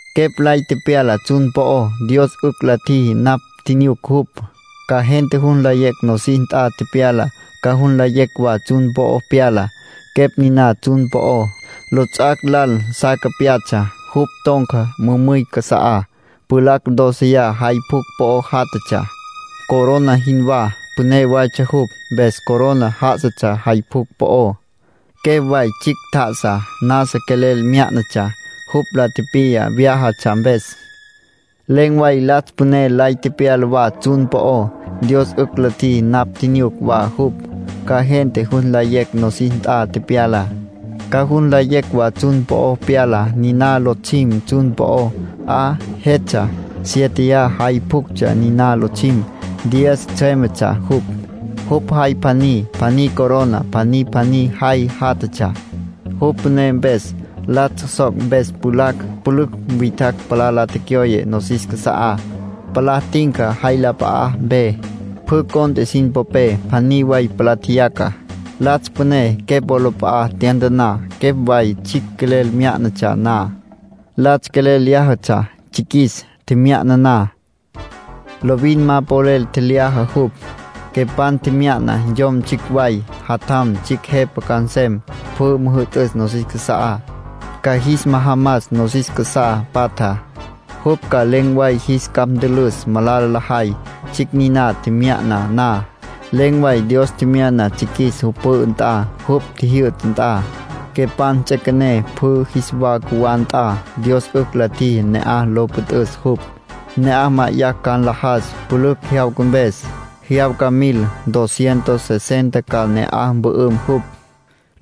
Quepj lay tepyala tsjun po'ó. Dios 'ücj la tjiji napj tjinyuc jupj, ca gente jus nlayecj nosis nt'a pyalá, ca jus nlayecj wa tsjun po'o pyalá. Quepj niná tsjun po'ó, lots'ac' lal sa capyatsja. Jupj ton̈ca mümüy casa'á. Pjulacj dóceya jay pjucj po'o játjatsja, corona jinwá. (Püné waytsja jupj, mpes corona já'asatsja jay pjucj po'ó.) Quepj way tsjicj tjá'asa, nasa quelel myá'natsja. Jupj la tipiya vyájatsja mpes. Len̈ way Latsj Püné lay tepyala wa tsjun po'ó. Dios 'ücj la tjiji napj tjinyuc wa jupj, ca gente jus nlayecj nosis nt'a pyalá, ca jus nlayecj wa tsjun po'o pyalá. Niná Lotsjim tsjun po'ó, 'a jetsja. Siéteya jay pjuctsja niná Lotsjim. Diez tsjüémetsja jupj. Jupj jay pjaní pjaní corona pjaní pjaní jay játjatsja, jupj püné mpes. Latsj soc' mpes pjulacj pülücj witjacj palá la tecyoye nosis casa'á, palá tinca jay la p'a'apé. Pjü cont'e sin popé, pjaní way palá tjeyaca. Latsj Püné Quepj wolap'a'a tyantaná, Quepj way tsjicj quelel myá'natsja na. Latsj quelel lyájatsja Tsjiquis, tjemya'na na. Lovin ma polel tjelyaja jupj. Quepan tjemya'na yom tsjicj way. Jatjam tsjicj Jepa ca nsem, pjü müjü'tüs nosis casa'á, ca jis majamas nosis casá patjá. Jupj ca len̈ way jis capj ntülüs malala lajay. Tsjicj niná tjemya'na na, len̈ way Dios tjemyana Tsjiquis jupj pü'ü nt'a, jupj jyü'ta nt'a. Quepan ts'üequené pjü jis wa cjuwá nt'a. Dios 'ücj la tjiji ne'aj lo püt'üs jupj. Ne'aj ma'ayacj ca nlajas pülücj jyawca mpes. Jyawca mil, dos cientos sesenta ca ne'aj mpü'üm jupj.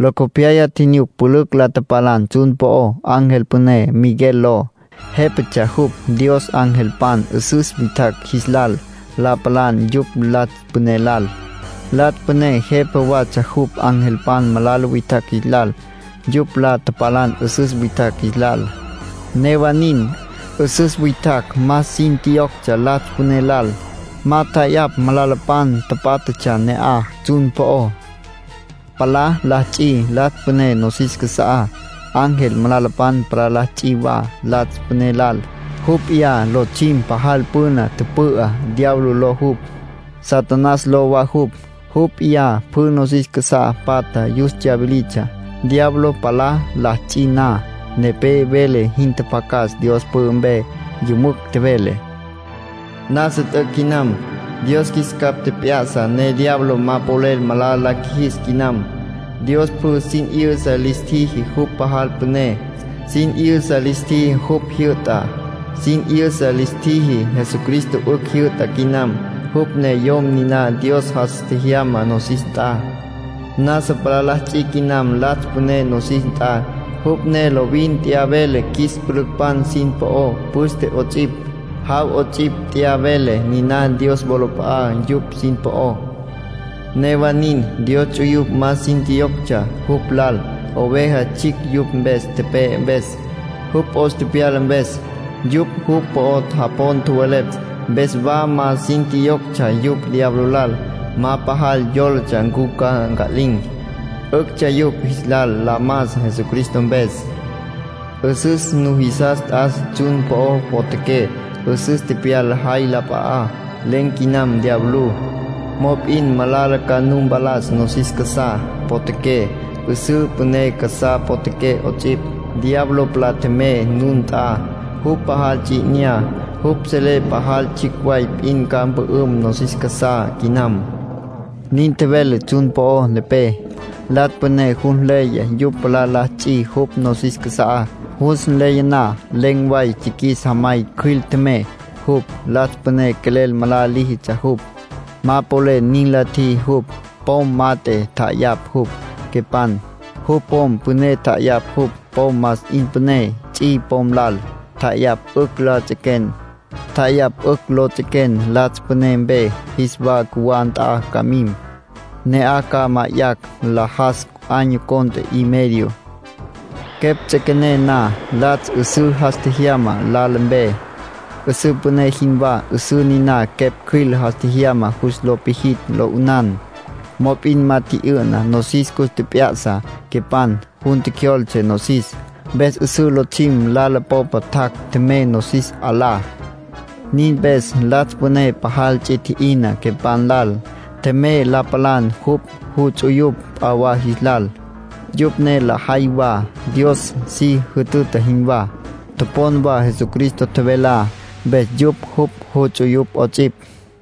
Locopyaya tjinyuc pülücj la tapalan tsjun po'ó. Ángel püné, Miguel ló, jépatsja jupj Dios angelpan 'üsüs witjacj jis lal. La tapalan yupj Latsj Püné lal. Latsj Püné jepa watsja jupj angelpan malala witjacj jis lal. Yupj la tapalan 'üsüs witjacj jis lal. Newa nin, 'üsüs witjacj más sin tjiyoctsja Latsj Püné lal. Ma tja'ayapj malalapan tapátjatsja ne'aj, tsjun po'ó. Palá la ts'i Latsj Püné nosis casa'á. Ángel malalapan palá la ts'i wa Latsj Püné lal. Jupj p'iyá lotsjim pajal püna tüpü'á. Diablo ló jupj, Satanás ló wa jupj. Jupj p'iyá pjü nosis casá patja yus tsyawilitsja. Diablo palá la ts'i na, nepé vele jin tjapjacas Dios pü'ü mpe. Yümücj tjevele: “Nasa t'üc' quinam. Dios qjuis capj tjep'ya'sa ne diablo ma polel malala la qjuijis quinam. Dios pjü sin 'yüsa lis tjiji jupj pajal püné. Sin 'yüsa lis tjiji jupj jyü'ta. Sin 'yüsa lis tjiji Jesucristo 'ücj jyü'ta quinam. Jupj ne Yom niná Dios jas tjejyamá nosis nt'a. Nasa palá la ts'i quinam Latsj Püné nosis nt'a, jupj ne lovin t'ya vele qjuis pülücpan sin po'ó. Püste 'ots'ipj, jaw 'ots'ipj t'ya vele niná Dios wolap'a'á yupj sin po'ó. Newa nin, Dios ts'uyupj más sin tjiyoctsja jupj lal, Oveja Tsjicj yupj mpes tepe'e mpes, jupj 'os tepyala mpes. Yupj jupj po'o japon tjowelepj, mpes wa más sin tjiyoctsja yupj diablo lal. Ma pajal yólatsja ncu ca nca'lin̈; 'üctsja yupj jis lal la mas Jesucristo mpes. 'Üsüs nujisas t'as tsjun po'o potjaqué. 'Üsüs tepyala jay la p'a'á. Len̈ quinam diablú. Mop'in malala ca nu mpalas nosis casá potjaqué, 'üsǘ püné casá potjaqué 'ots'ipj. Diablo palá tjemey nun nt'a. Jupj pajal ts'i 'inyá. Jupj selé pajal tsjicj way p'in ca mpü'üm nosis casá quinam”, nin tjevele tsjun po'ó nepé. Latsj Püné jus nleya yupj palá la ts'i jupj nosis casa'á. Jus nleya na, len̈ way tsjiquis jamay cjüil tjemey jupj. Latsj Püné quelel malala líjitsja jupj. Ma polel nin la tjiji jupj; pom mat'e tja'ayapj jupj, Quepan. Jupj pom püné tja'ayapj jupj, pom más 'in püné, ts'i pom lal. Tja'ayapj 'ücj lo ts'equen Latsj Püné mpe, jis wa cjuwá nt'a ca mim. Ne'aj ca ma'ayacj nlajas año cont'e y medio. Quepj ts'üequené na, Latsj 'üsǘ jas tjejyama lala mpe, 'üsǘ püné jinwá; 'üsǘ niná quepj cjüil jas tjejyama jus lo pijitj, lo 'ünan. Mop'in ma tji'yü'na; nosis cus tjep'ya'sa quepan. Jun tjecjyoltse nosis, mpes 'üsǘ Lotsjim lala popa tjac' tjemey nosis 'alá. Nin mpes Latsj Püné pajal ts'i tji'ina Quepan lal. Tjemey la palan jupj juts'uyupj p'a wa jis lal. Yupj ne lajay wa Dios si jütüta jinwá, topon wa Jesucristo tjevelá, mpes yupj jupj juts'uyupj 'ots'ipj.